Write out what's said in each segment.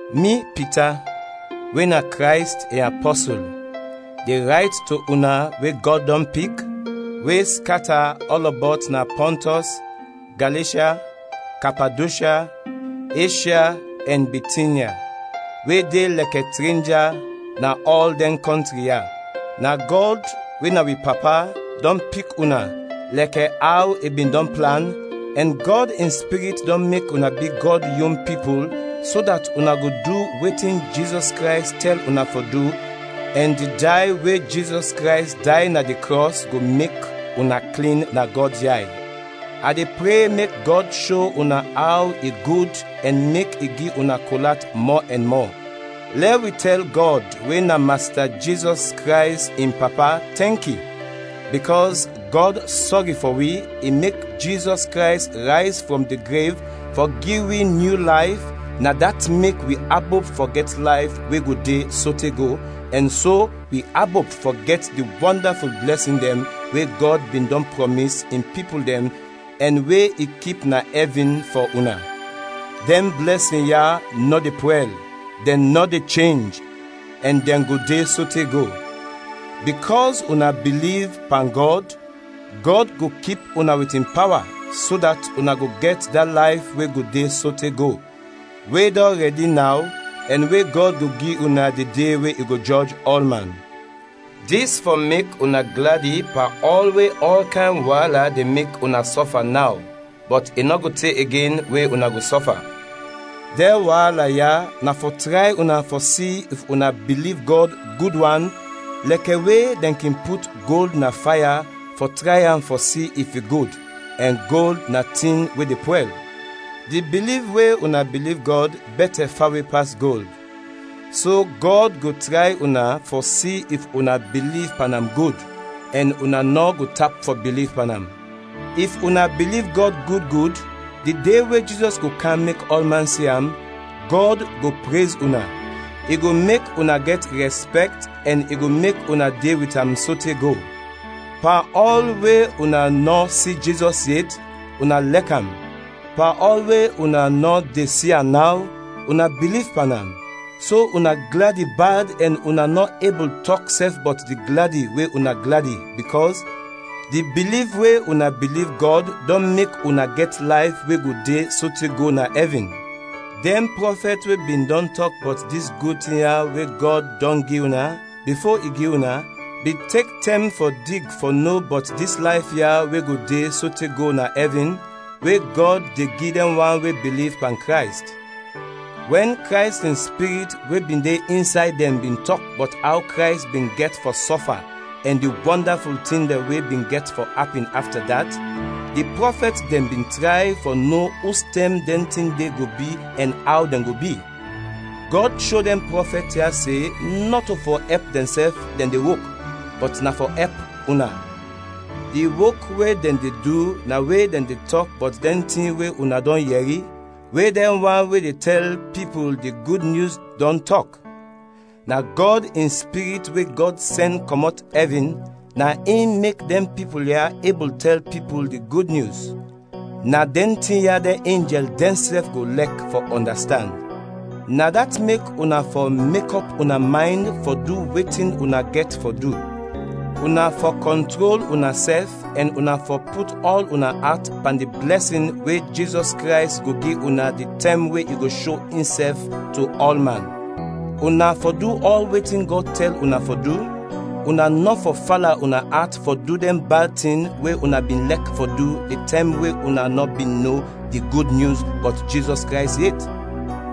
Mi Pita, we na Krays in apɔsul, de rayt to una we Gɔd dɔn pik, we skata ɔlɔbɔt na Pɔntɔs, Galeshya, Kapadoshya, Eshya ɛn Bitinya, we de lɛkɛ trenja na ɔl dɛn kɔntri ya. Na Gɔd, we na wi Papa, dɔn pik una, lɛkɛ aw i bin dɔn plan, ɛn Gɔd in Spirit dɔn mek una bi Gɔd yon pipul, so dat una go du wetin Jizɔs Krays tɛl una fɔ du, ɛn di day we Jizɔs Krays day na di krɔs go mek una klin na Gɔd yay. A de pre mek Gɔd sho una aw i gud ɛn mek i gi una kol at mɔ ɛn mɔ. Lɛ wi tɛl Gɔd, we na Masta Jizɔs Krays in Papa, tɛnki! Bikɔs Gɔd sɔri fɔ wi, i mek Jizɔs Krays rayz frɔm di grev fɔ gi wi nyu layf, na dat mek wi abop fɔ gɛt layf we go de sote go, ɛn so, wi abop fɔ gɛt di wɔndaful blɛsin dɛn we Gɔd bin dɔn prɔmis in pipul dɛn ɛn we i kip na ɛvin fɔ una. Dɛn blɛsin ya nɔ de pwɛl, dɛn nɔ de chenj ɛn dɛn go de sote go. Bikɔs una biliv pan Gɔd, Gɔd go kip una wit in pawa, so dat una go gɛt da layf we go de sote go, we dɔn rɛdi naw ɛn we Gɔd go gi una di de we i go jɔj ɔlman. Dis fɔ mek una gladi pan ɔl we ɔl kayn waala de mek una sɔfa naw; bɔt i nɔ go te igen we una go sɔfa. Dɛn waala ya na fɔ tray una fɔ si if una biliv Gɔd gud wan, lɛkɛ we dɛn kin put gold na faya fɔ tray am fɔ si if i gud, ɛn gold na tin we de pwɛl. Di biliv we una biliv Gɔd bɛtɛ fawe pas gold, so Gɔd go tray una fɔ si if una biliv pan am gud, ɛn una nɔ go tap fɔ biliv pan am. If una biliv Gɔd gud gud, di de we Jizɔs go kam mek ɔlman si am, Gɔd go prez una, i go mek una gɛt rɛspɛkt ɛn i go mek una de wit am sote go. Pan ɔl we una nɔ si Jizɔs yet, una lɛk am. Pan ɔl we una nɔ de si am naw, una biliv pan am; so una gladi bad ɛn una nɔ ebul tɔk sɛf bɔt di gladi we una gladi, bikɔs di biliv we una biliv Gɔd dɔn mek una gɛt layf we go de sote go na ɛvin. Dɛn prɔfɛt we bin dɔn tɔk bɔt dis gud tin ya we Gɔd dɔn gi una, bifo i gi una, bin tek tɛm fɔ dig fɔ no bɔt dis layf ya we go de sote go na ɛvin, we Gɔd de gi dɛn wan we biliv pan Krays. Wɛn Krays in Spirit we bin de insay dɛn bin tɔk bɔt aw Krays bin gɛt fɔ sɔfa ɛn di wɔndaful tin dɛn we bin gɛt fɔ apin afta dat, di prɔfɛt dɛn bin tray fɔ no ustɛm dɛn tin de go bi ɛn aw dɛn go bi. Gɔd sho dɛn prɔfɛt ya se nɔto fɔ ɛp dɛnsɛf dɛn de wok, bɔt na fɔ ɛp una. Di wok we dɛn de du na we dɛn de tɔk bɔt dɛn tin we una dɔn yɛri, we dɛn wan we de tɛl pipul di Gud Nyus dɔn tɔk. Na Gɔd in Spirit we Gɔd sɛn kɔmɔt ɛvin, na in mek dɛn pipul ya ebul tɛl pipul di Gud Nyus. Na dɛn tin ya dɛn enjɛl dɛnsɛf go lɛk fɔ ɔndastand. Na dat mek una fɔ mekɔp una maynd fɔ du wetin una gɛt fɔ du, una fɔ kɔntrol unasɛf ɛn una fɔ put ɔl una at pan di blɛsin we Jizɔs Krays go gi una di tɛm we i go sho insɛf to ɔlman. Una fɔ du ɔl wetin Gɔd tɛl una fɔ du, una nɔ fɔ fala una at fɔ du dɛn bad tin we una bin lɛk fɔ du di tɛm we una nɔ bin no di Gud Nyus bɔt Jizɔs Krays yet.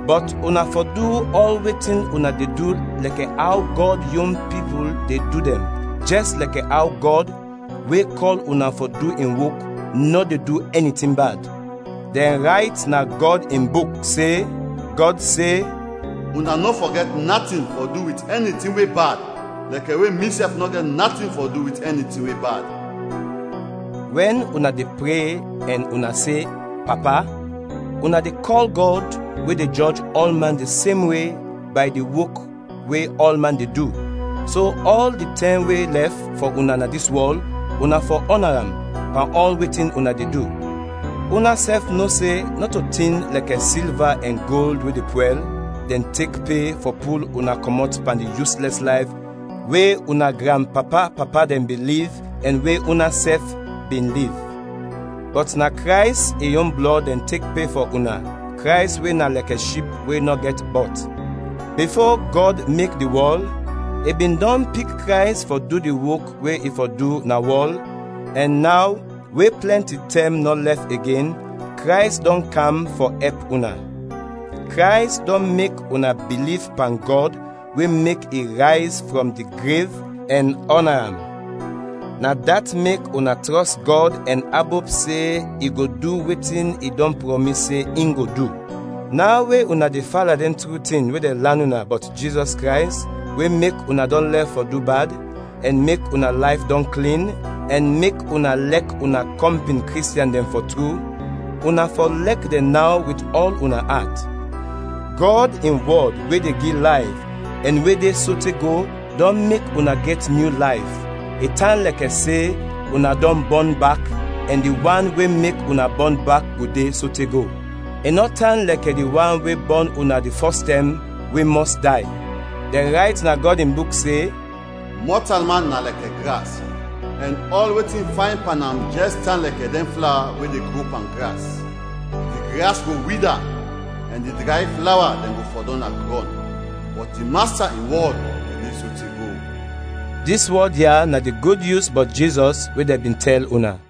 Bɔt una fɔ du ɔl wetin una de du lɛkɛ aw Gɔd yon pipul de du dɛn, jɛs lɛkɛ aw Gɔd, we kɔl una fɔ du in wok, nɔ de du ɛni tin bad. Dɛn rayt na Gɔd in Buk se, Gɔd se, “Una nɔ fɔ gɛt natin fɔ du wit ɛni tin we bad lɛkɛ we misɛf nɔ gɛt natin fɔ du wit ɛni tin we bad.” Wɛn una de pre ɛn una se, “Papa,” una de kɔl Gɔd, we de jɔj ɔlman di sem we, bay di wok we ɔlman de du, so ɔl di tɛm we lɛf fɔ una na dis wɔl, una fɔ ɔna am, pan ɔl wetin una de du. Unasɛf no se nɔto tin lɛkɛ silva ɛn gold we de pwɛl, dɛn tek pe fɔ pul una kɔmɔt pan di yuslɛs layf we una granpapa-papa dɛn bin liv ɛn we unasɛf bin liv; bɔt na Krays in yon blɔd dɛn tek pe fɔ una, Krays we na lɛkɛ Ship we nɔ gɛt bɔt. Bifo Gɔd mek di wɔl, i bin dɔn pik Krays fɔ du di wok we i fɔ du na wɔl, ɛn naw, we plɛnti tɛm nɔ lɛf igen, Krays dɔn kam fɔ ɛp una. Krays dɔn mek una biliv pan Gɔd, we mek i rayz frɔm di grev ɛn ɔna am; na dat mek una trɔs Gɔd ɛn abop se i go du wetin i dɔn prɔmis se in go du. Naw we una de fala dɛn tru tin we dɛn lan una bɔt Jizɔs Krays, we mek una dɔn lɛf fɔ du bad, ɛn mek una layf dɔn klin, ɛn mek una lɛk una kɔmpin Kristiɛn dɛn fɔ tru, una fɔ lɛk dɛn naw wit ɔl una at. Gɔd in wɔd we de gi layf ɛn we de sote go dɔn mek una gɛt nyu layf; i tan lɛkɛ se, una dɔn bɔn bak, ɛn di wan we mek una bɔn bak go de sote go; i nɔ tan lɛkɛ di wan we bɔn una di fɔs tɛm, we mɔs day. Dɛn rayt na Gɔd in Buk se, “Mɔtalman na lɛkɛ gras, ɛn ɔl wetin fayn pan am jɛs tan lɛkɛ dɛn flawa we de gro pan gras. Di gras go wida ɛn di dray flawa dɛn go fɔdɔm na grɔn, bɔt di Masta in wɔd go de sote go.” Dis wɔd ya na di Gud Nyus bɔt Jizɔs we dɛn bin tɛl una.